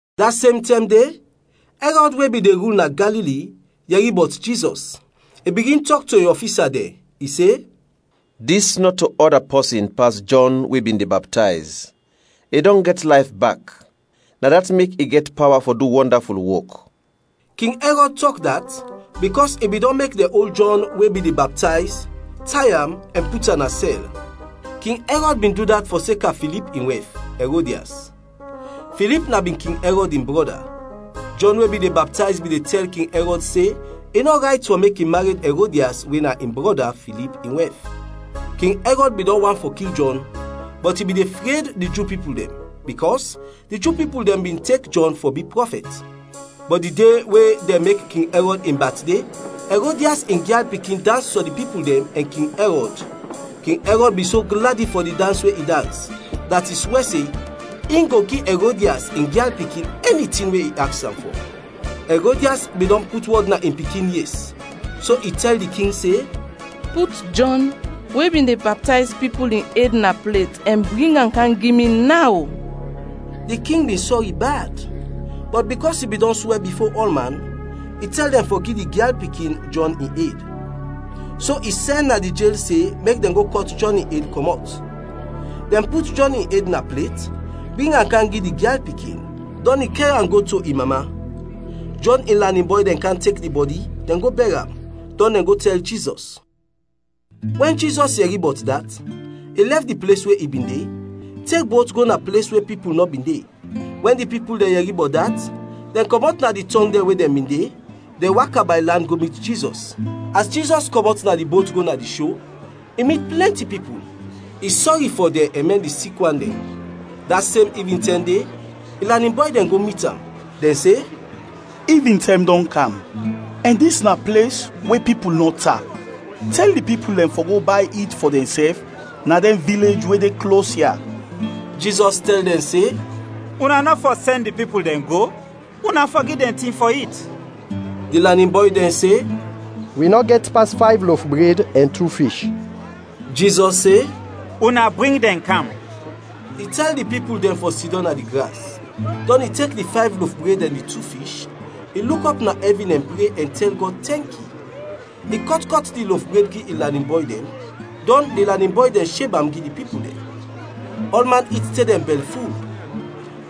Da sem tɛm de, Ɛrɔd we bin de rul na Galili, yɛri bɔt Jizɔs. I bigin tɔk to in ɔfisa dɛn, i se, “Dis nɔto ɔda pɔsin pas Jɔn we bin de baptayz, i dɔn gɛt layf bak. Na dat mek i gɛt pawa fɔ du wɔndaful wok.” King Ɛrɔd tɔk dat, bikɔs i bin dɔn mek dɛn ol Jɔn we bin de baptayz, tay am, ɛn put am na sɛl. King Ɛrɔd bin du dat fɔseka Filip in wɛf, Ɛrodias; Filip na bin King Ɛrɔd in brɔda. Jɔn we bin de baptayz bin de tɛl King Ɛrɔd se i nɔ rayt fɔ mek i mared Ɛrodias we na in brɔda, Filip in wɛf. King Ɛrɔd bin dɔn want fɔ kil Jɔn, bɔt i bin de fred di Ju pipul dɛn, bikɔs di Ju pipul dɛn bin tek Jɔn fɔ bi prɔfɛt. Bɔt di de we dɛn mek King Ɛrɔd in batde, Ɛrodias in gyal pikin dans fɔ di pipul dɛn ɛn King Ɛrɔd. King Ɛrɔd bin so gladi fɔ di dans we i dans, dat i swɛ se, in go gi Ɛrodias in gyal pikin ɛni tin we i aks am fɔ. Ɛrodias bin dɔn put wɔd na in pikin yes, so i tɛl di king se, “Put Jɔn, we bin de baptayz pipul, in ed na plet ɛn bring am kam gi mi naw!” Di king bin sɔri bad, bɔt bikɔs i bin dɔn swɛ bifo ɔlman, i tɛl dɛn fɔ gi di gyal pikin, Jɔn in ed. So i sɛn na di jel se mek dɛn go kɔt Jɔn in ed kɔmɔt. Dɛn put Jɔn in ed na plet, bring am kam gi di gyal pikin, dɔn i kɛr am go to in mama. Jɔn in lanin bɔy dɛn kam tek di bɔdi, dɛn go bɛr am, dɔn dɛn go tɛl Jizɔs. Wɛn Jizɔs yɛri bɔt dat, i lɛf di ples we i bin de, tek bot go na ples we pipul nɔ bin de. Wɛn di pipul dɛn yɛri bɔt dat, dɛn kɔmɔt na di tɔng dɛn we dɛn bin de, dɛn waka bay land go mit Jizɔs. As Jizɔs kɔmɔt na di bot go na di sho, i mit plɛnti pipul; i sɔri fɔ dɛn ɛn mɛn di sik wan dɛn. Da sem ivintɛm de, in lanin bɔy dɛn go mit am, dɛn se, “Ivintɛm dɔn kam, ɛn dis na ples we pipul nɔ tap. Tɛl di pipul dɛn fɔ go bay it fɔ dɛnsɛf na dɛn vilej we de klos ya.” Jizɔs tɛl dɛn se, “Una nɔ fɔ sɛn di pipul dɛn go, una fɔ gi dɛn tin fɔ it!” Di lanin bɔy dɛn se, “Wi nɔ gɛt pas fayv lof bred ɛn tu fish.” Jizɔs se, “Una bring dɛn kam.” I tɛl di pipul dɛn fɔ sidɔm na di gras; dɔn i tek di fayv lof bred ɛn di tu fish, i luk ɔp na ɛvin ɛn pre ɛn tɛl Gɔd tɛnki. I kɔt kɔt di lof bred gi in lanin bɔy dɛn, dɔn di lanin bɔy dɛn sheb am gi di pipul dɛn. Ɔlman it te dɛn bɛlful.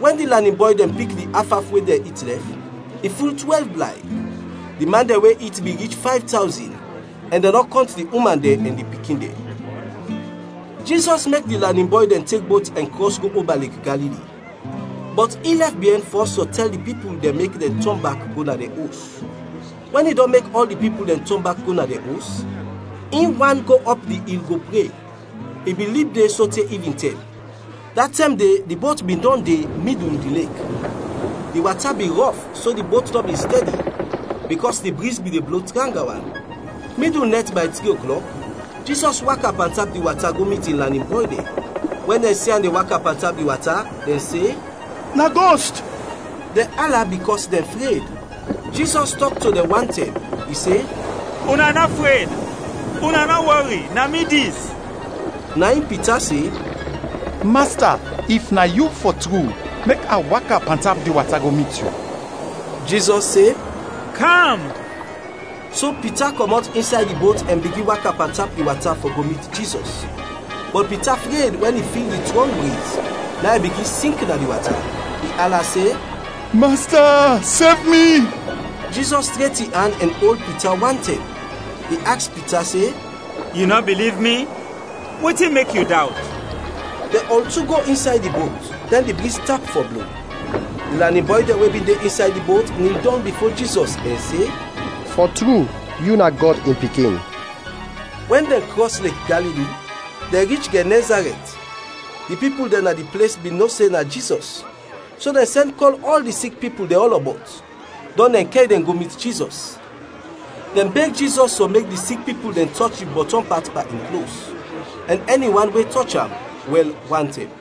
Wɛn di lanin bɔy dɛn pik di af af we dɛn it lɛf, i ful twɛlv blay. Di man dɛn we it bin rich fayv tawzin, ɛn dɛn nɔ kɔnt di uman dɛn ɛn di pikin dɛn. Jizɔs mek di lanin bɔy dɛn tek bot ɛn krɔs go oba Lek Galili, bɔt in lɛf biɛn fɔs fɔ tɛl di pipul dɛn mek dɛn tɔn bak go na dɛn os. Wɛn i dɔn mek ɔl di pipul dɛn tɔn bak go na dɛn os, in wan go ɔp di il go pre. I bin lib de sote ivintɛm. Da tɛm de di bot bin dɔn de midul di lek. Di wata bin rɔf so di bot nɔ bin stɛdi, bikɔs di briz bin de blo tranga wan. Midul nɛt bay tri oklɔk, Jizɔs waka pantap di wata go mit in lanin bɔy dɛn. Wɛn dɛn si am de waka pantap di wata, dɛn se, “Na gost,” dɛn ala bikɔs dɛn fred. Jizɔs tɔk to dɛn wantɛm. I se, “Una nɔ fred, una nɔ wɔri, na mi dis!” Na in Pita se, “Masta, if na yu, fɔ tru, mek a waka pantap di wata go mit yu.” Jizɔs se, “Kam!” So Pita kɔmɔt insay di bot ɛn bigin waka pantap di wata fɔ go mit Jizɔs. Bɔt Pita fred wɛn i fil di trɔng briz, na in i bigin sink na di wata. I ala se, “Masta, sev mi!” Jizɔs tret in an ɛn ol Pita wantɛm. I aks Pita se, “Yu nɔ biliv mi? Wetin mek yu dawt?” Dɛn ɔl tu go insay di bot, dɛn di briz tap fɔ blo. Di lanin bɔy dɛn we bin de insay di bot nil dɔng bifo Jizɔs ɛn se, “Fɔ tru, yu na Gɔd in Pikin!” Wɛn dɛn krɔs Lek Galili, dɛn rich Gɛnɛzarɛt. Di pipul dɛn na di ples bin no se na Jizɔs; so dɛn sɛn kɔl ɔl di sik pipul dɛn ɔlɔbɔt, dɔn dɛn kɛr dɛn go mit Jizɔs. Dɛn beg Jizɔs fɔ mek di sik pipul dɛn tɔch di bɔtɔm pat pan in klos; ɛn ɛni wan we tɔch am, wɛl wantɛm.